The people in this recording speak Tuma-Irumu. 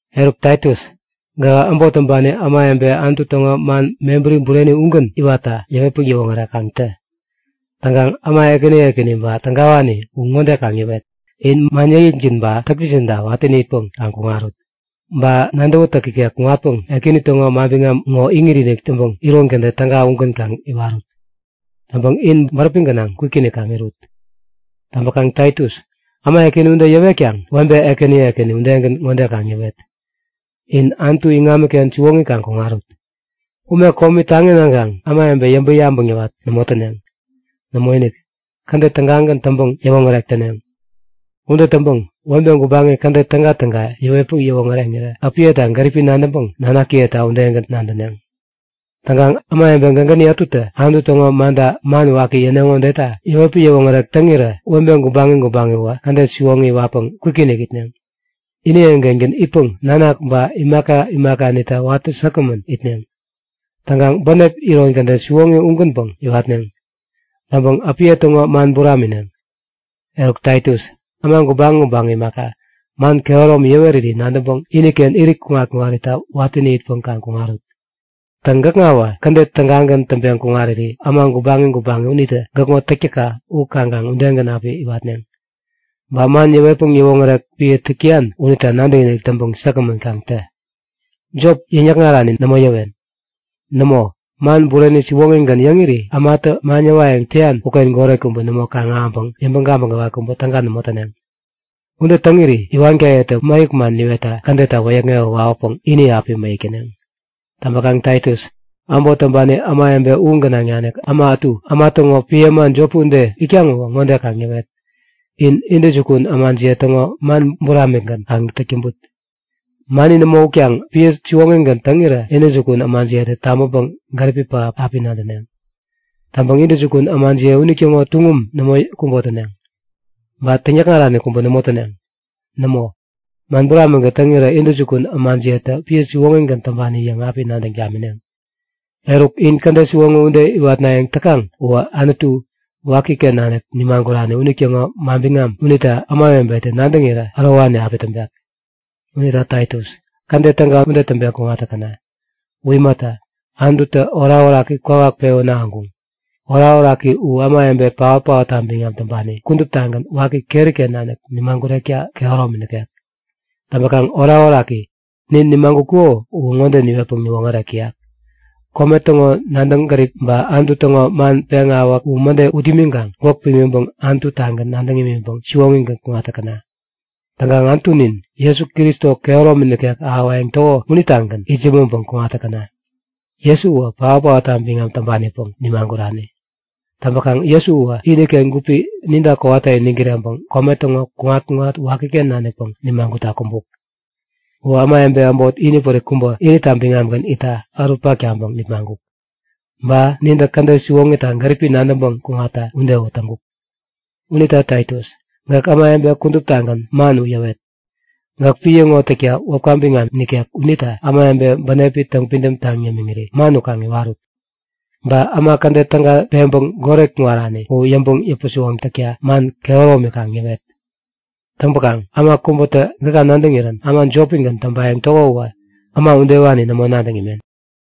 Eruk Taitus, gähä äbot täŋpani ämawebe Anutu täŋo man mebäri bureni ugän iwatta yäwetpäŋ yäwoŋärek kaŋ tä. Täŋkaŋ äma ekäni ekäni ba tägawani u ŋode kaŋ yäwet; In man yäkyäkjin ba täktäkjinta watä itpäŋ kaŋ kuŋarut. Ba nadäwätäk ikek kuŋatpäŋ Ekäni täŋo manbiŋam ŋo iŋit-inik täŋpäŋ iron kädet täga ugän kaŋ iwarut. Täŋpäŋ in bäräpi gänaŋ kwikinik kaŋ irut. Täŋpäkaŋ Taitus, äma ekäni ude yäwetkaŋ webe ekäni ekäni udegän ŋode kaŋ yäwet; In Anutu iŋamiken siwoŋi kaŋ kuŋarut. Ume komi taŋi naŋkaŋ ämawebe yäŋpäŋ-yabäŋ yäwat nämo täneŋ. Nämoinik! Kädet tägagän täŋpäŋ-yäwoŋärek täneŋ. Ude täŋpäŋ webe gubaŋi kädet tägatäga yäwetpäŋ yäwoŋäreŋirä äpiyeta gäripi nadäŋpäŋ nanakiyeta udegän nadäneŋ. Täŋkaŋ ämawebe gägäni ätutä Anutu täŋo manta man waki yäneŋo udeta yäwetpäŋ yäwoŋärek täŋirä webe gubaŋi gubaŋi uwä kädet siwoŋi iwatpäŋ kwikinik itneŋ. Ini eŋi-kengän itpäŋ nanak ba imaka imakanita watä säkgämän itneŋ. Täŋkaŋ bänep iron kädet siwoŋi ugänpäŋ iwatneŋ. Täŋpäŋ äpiye täŋo man buramineŋ. Eruk Taitus, äma gubaŋi gubaŋi imaka, man kehäromi yäweriri nadäŋpäŋ iniken irit kuŋat-kuŋarita watäni itpäŋ kaŋ kuŋarut. Täŋ gäkŋawä kädet tägagän täŋpeŋ kuŋariri äma gubaŋi gubaŋi unitä gäkŋo täktäkka u kaŋkaŋ udegän api iwatneŋ. Ba man yäwetpäŋ yäwoŋärek piä täk täyan unita nadäkinik täŋpäŋ säkgämän kaŋ tä. Jop, yäŋ-yäkŋarani nämo yäwen. Nämo, man bureni siwoŋigän yäŋiri ämatä man yäwayäŋ täyan uken goret kubä nämo kaŋ-ahäŋpäŋ yäŋpäŋ gabäŋ gäwat kubä täga nämo täneŋ. Ude täŋiri iwaniyetä mäyäk man niwetta kädetta wäyäkŋewä wawäpäŋ ini api mäyäk täneŋ. Täŋpäkaŋ Taitus, äbot täŋpani ämawebe u gänaŋ nanik äma ätu äma täŋo piä äma jopi ude itkaŋ uwä ŋode kaŋ yäwet; In intäjukun ämajiye täŋo man buramikgän kaŋ täk täŋput. Mani nämo utkaŋ piä siwoŋigän täŋirä intäjukun ämajiyetä tabäŋpäŋ gäripi pähap api nadäneŋ. Täŋpäŋ intäjukun ämajiye unitäŋo tuŋum nämo kubotäneŋ. Ba täŋyäkŋarani kubä nämo täneŋ. Nämo, man buramikgän täŋirä intäjukun ämajiyetä piä siwoŋigän täŋpani yäŋ api nadäŋ tamineŋ. Eruk in kädet siwoŋi ude iwatnayäŋ täkaŋ uwä Anutu, wakiken nanik nimagurani unitäŋo manbiŋam unita ämawebetä nadäŋirä ärowani api täŋpek. Unita Taitus, kädet täga ude täŋpeŋ kuŋat täkäna. U imata, Anututä orakoraki kwawak pewän ahäŋkuŋ. Orakoraki u ämawebe paot-paotta biŋam täŋpani kuduptagän waki keri-ken nanik yämagurekta kehäromi nikek. Täŋpäkaŋ orakoraki, nin nimagutkuko uwä ŋode niwetpäŋ niwoŋärek täyak; Kome täŋo nadäŋ gärip ba Anutu täŋo man peŋawäk u mäde ut imiŋkaŋ gwäk pimiŋpäŋ Anutu-tagän nadäŋ imiŋpäŋ siwoŋigän kuŋat täkäna. Täŋkaŋ Anutunin Jesu Kristo kehäromi nikek ahäwayäŋ täko unitagän itsämäŋpäŋ kuŋat täkäna. Jesu uwä paot-paotta biŋam täŋpanipäŋ nimagurani. Täŋpäkaŋ Jesu uwä iniken gupi ninta kowata iniŋ kireŋpäŋ kome täŋo kuŋat-kuŋat wakiken nanikpäŋ nimagutta kumbuk. Uwä ämawebe äbot inipärik kubä inita biŋamgän itta ärutpak taŋpäŋ nipmaŋkuk. Ba nintä kädet siwoŋita gäripi nadäŋpäŋ kuŋatta udewä täŋkuk. Unita Taitus, gäk ämawebe kuduptagän man u yäwet. Gäk piä ŋo täkta wäpka biŋam nikek unita ämawebe bänepi täŋpidäm taŋ yämiŋiri man u kaŋ iwarut. Ba äma kädet täga peŋpäŋ goret kuŋarani u yäŋpäŋ yäpä-siwoŋ takta man kehäromi kaŋ yäwet. Täŋpäkaŋ äma kubätä gäka nadäŋirän äma jopigän täŋpayäŋ täko uwä, äma udewani nämo nadäŋ imen.